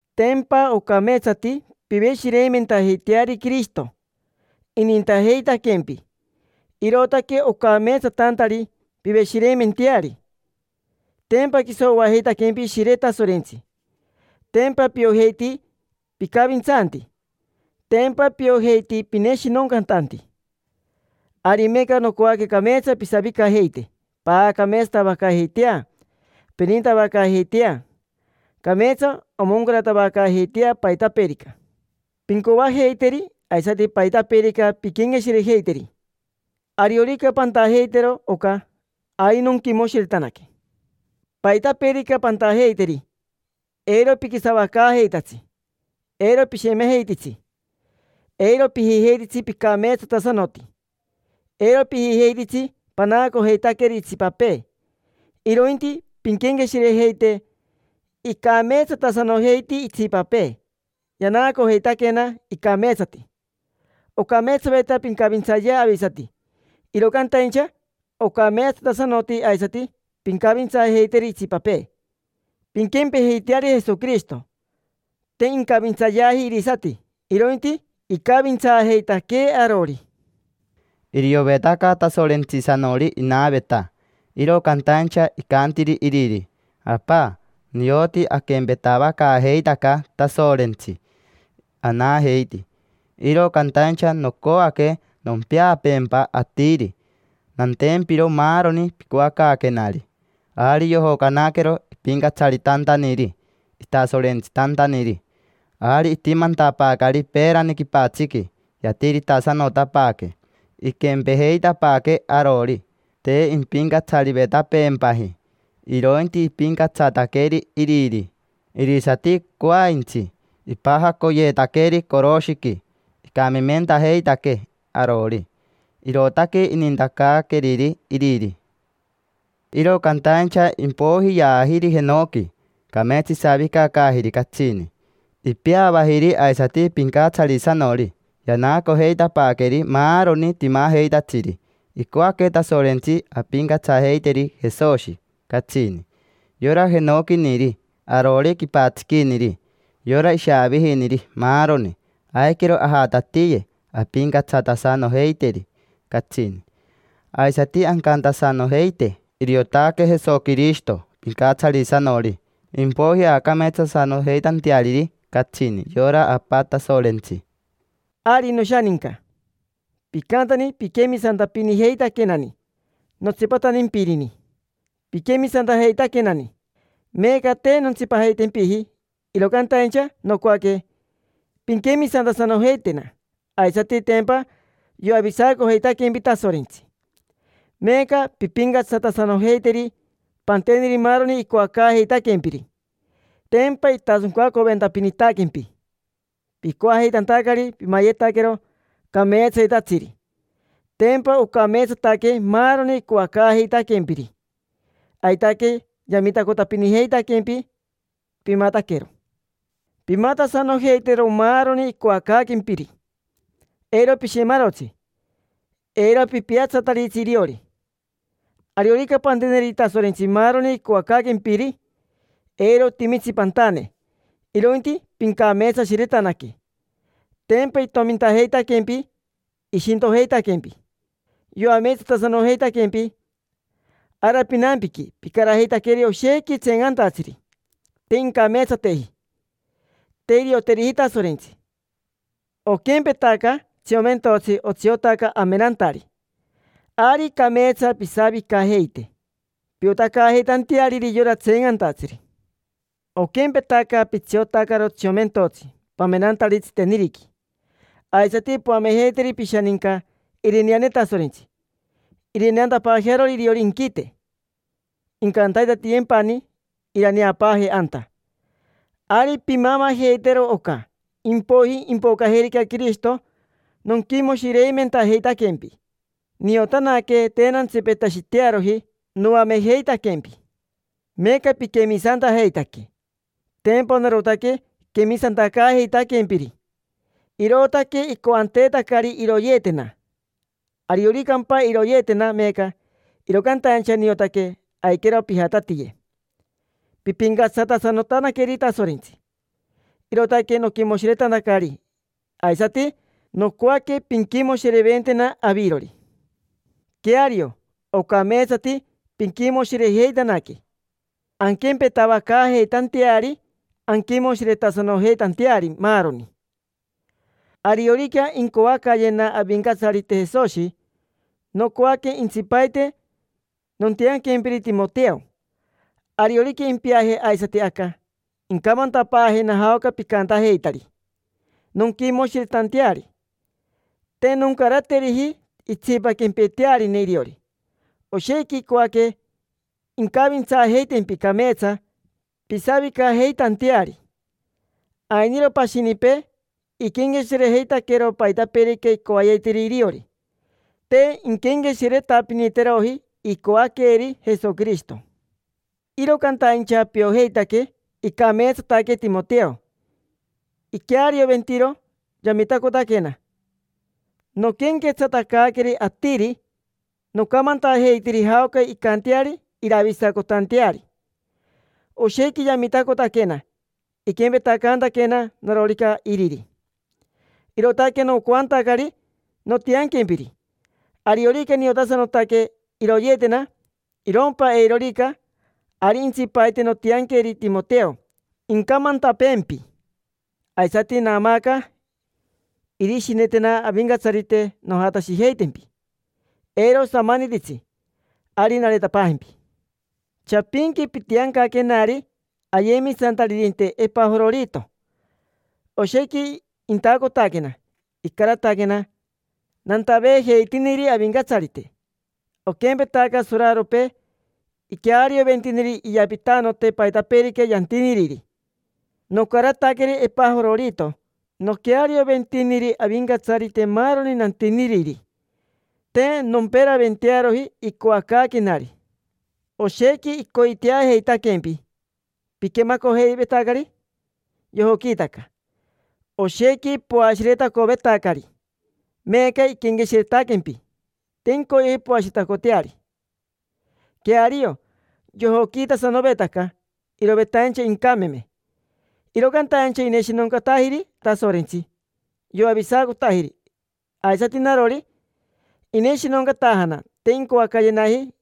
Tempa ocameetsati piveshireimentajeiteari Quirishito. Inintajeitaquempi, irootaque ocameetsatantari piveshireimenteari. Tempa quiso oajeitaquempi Ishire Tasorentsi. Tempa piojeiti picavintsanti. Tempa piojeiti pineshinoncatanti. Ari meeca nocoaque cameetsa pisavicajeite, paacameetsatavacaajeitea, pinintavacaajeitea. Cameetsa omoncaratavacaajeitea paitapeerica pincoajeiteri aisati paitapeerica pinquenqueshirejeiteri. Ariorica pantajeitero oca, ari nonquimoshiretanaque. Paitapeerica pantajeiteri, eiro piquisavacaajeitatsi, eiro pishemejeititsi. Eiro pijijeititsi picameetsatasanoti, eiro pijijeititsi panaacojeitaqueri itsipapee, irointi pinquenqueshirejeite: “Icameetsatasanojeiti itsipapee, yanaacojeitaquena icameetsati”. Ocameetsaveta pincavintsayea avisati, iro cantaincha ocameetsatasanoti aisati pincavintsaajeiteri itsipapee. Pinquempejeiteari Jesoquirishito: te incavintsayeaji irisati, irointi icavintsaajeitaquee arori. Iriovetaca Tasorentsisanori inaveta, iro cantaincha icantiri iriri: “Apa, nioti aquempetavacaajeitaca, Tasorentsi anajeiti, iro cantaincha nocoaque nompeapeempa atiri, nantempiro maaroni picoacaaquenari”. Ari yojocanaquero ipincatsaritantaniri, itasorentsitantaniri. Ari itimantapaacari peerani quipatsiqui, yatiritasanotapaaque: iquempejeitapaaquee arori. Te impincatsarivetapeempaji, irointi ipincatsataqueri iriri. Irisati coaintsi ipajacoyeetaqueri coroshiqui, icamimentajeitaquee arori. Irootaque inintacaaqueriri iriri. Iro cantaincha impoiji yaajiri jenoqui, cameetsa isavicacaajiri catsini. Ipeavajiri aisati pincatsarisanori, yanaacojeitapaaqueri maaroni timajeitatsiri. Icoaque Tasorentsi ampincatsajeiteri Jesoshi, catsini: yora jenoquiniri, arori quipatsiquiniri, yora ishaavijiniri, maaroni. Aiquero ajatatiye, ampincatsatasanojeiteri catsini. Aisati ancantasanojeite: “Iriotaque Jesoquirishito Pincatsarisanori”, impoiji aacameetsatasanojeitanteariri catsini yora Apa Tasorentsi. Ari, noshaninca, picantani piquemisantapinijeitaquenani. Notsipatantimpiniri piquemisantajeitaquenani. Meeca te nontsipajeitempiji, iro cantaincha nocoaque pinquemisantasanojeitena aisati. Tempa yoavisacojeitaquempi Tasorentsi: meeca pimpincatsatasanojeiteri, panteneri maaroni icoacaajeitaquempiri. Tempa itasoncacoventapinitaquempi, picoajeitantacari pimayetaquero cameetsayetatsiri. Tempa ocameetsataque maaroni icoacaajeitaquempiri, aitaque yamitacotapinijeitaquempi pimataquero. Pimatasanojeitero maaroni icoacaaquempiri: eiro pishemarotsi, eiro pipiatsataritsi iriori. Ariorica panteneri Tasorentsi maaroni icoacaaquempiri, eiro otimitsi pantane, irointi pincameetsashiretanaque. Tempa itomintajeitaquempi, ishintojeitaquempi. Yoameetsatasanojeitaquempi. Ara pinampiqui picarajeitaqueri oshequi tseencantatsiri: te incameetsateji, te irioteriji Tasorentsi. Oquempetaca tsiomentotsi otsiotaca amenantari, ari cameetsa pisavicajeite piotacaajeitanteariri yora tseencantatsiri. Oquempetaca pitsiotacaro tsiomentotsi pamenantari tsiteniriqui, aisati poamejeiteri pishaninca irineane Tasorentsi irineantapaajearori iriori inquite, incantaitatiyempani iraneapaaje anta. Ari pimamajeitero oca; impoiji, impocajerica Quirishito, nonquimoshireimentajeitaquempi. Niotanaque te nantsipetashitearoji noamejeitaquempi. Meeca piquemisantajeitaque. Tempa narotaque quemisantacaajeitaquempiri, irootaque icoanteetacari iroyeetena. Arioricampa iroyeetena meeca, iro cantaincha niotaque aiquero pijatatiye pimpincatsatasanotanaqueri Tasorentsi. Irootaque noquimoshiretantacari, aisati nocoaque pinquimoshireventena avirori. Queario, ocameetsati pinquimoshirejeitanaque, anquempetavacaajeitanteari, anquimoshiretasanojeitanteari, maaroni. Ariorica incoacayena Avincatsarite Jesoshi, nocoaque intsipaite nontianquempiri Timoteo. Ariorica impiaje aisati aca, incamantapaajena jaoca picantajeitari, nonquimoshiretanteari. Te noncarateriji itsipa quempetearine iriori: oshequi icoaque incavintsaajeitempi cameetsa pisavicajeitanteari. Ainiro pashinipee: iquenqueshirejeitaquero paitapeerica icoayetiri iriori, te inquenqueshiretapiniteroji icoaqueri Jesoquirishito. Iro cantaincha piojeitaque icameetsataque Timoteo, iquearioventiro yamitacotaquena noquenquetsatacaaqueri atiri: nocamantajeitiri jaoca incanteari iravisacotanteari. Oshequi yamitacotaquena, iquempetacantaquena narorica iriri. Irootaque nocoantacari nontianquempiri. Ariorica niotasanotaque iroyeetena, irompa eirorica, ari intsipaite nontianqueri Timoteo incamantapeempi. Aisati naamaaca irishinetena Avincatsarite nojatashijeitempi. Eiro osamanititsi, ari nareetapaajempi. Chapinqui pitiancaquenari ayemisantaririnte Epajororito, oshequi intacotaquena. Icarataquena, nantaveejeitiniri Avincatsarite. Oquempetaca soraropee iquearioventiniri iyapitanote paitapeerica yantiniriri, nocarataqueri Epajororito noquearioventiniri Avincatsarite maaroni nantiniriri; te nomperaventearoji icoacaaquenari. Oshequi icoiteajeitaquempi. Piquemacojeivetacari yojoquiitaca, oshequi poashiretacovetacari. Meeca iquenqueshiretaquempi, te incoyeji poashiretacoteari. Queario, yojoquiitasanovetaca, irovetaincha incameme, iro cantaincha ineshinoncatajiri Tasorentsi, yoavisacotajiri. Aisati narori, ineshinoncatajana, te incoacayenaji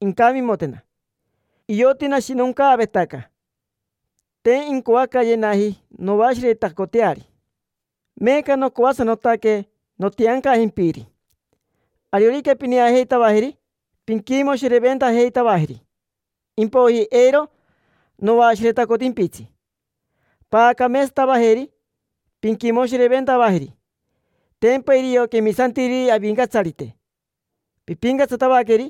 incamimotena. Ioti nashinoncaavetaca, te incoacayenaji noashiretacoteari. Meeca nocoasanotaque nontiancajempiri. Ariorica pineajeitavajeri, pinquimoshireventajeitavajeri, impoiji eiro noashiretacotimpitsi. Paacameetsatavajeri, pinquimoshireventavajeri; tempa irio quemisantiriri Avincatsarite. Pimpincatsatavaqueri,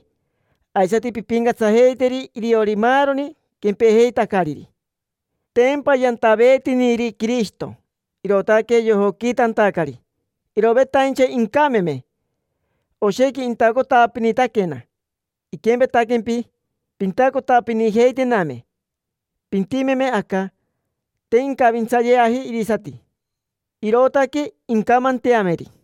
aisati pimpincatsajeiteri iriori maaroni quempejeitacariri. Tempa yantaveetiniri Quirishito, irootaque yojoquiitantacari, irovetaincha incameme. Oshequi intacotapinitaquena: iquempetaquempi pintacotapinijeitename, pintimeme aca. Te incavintsayeaji irisati, irootaque incamanteameri.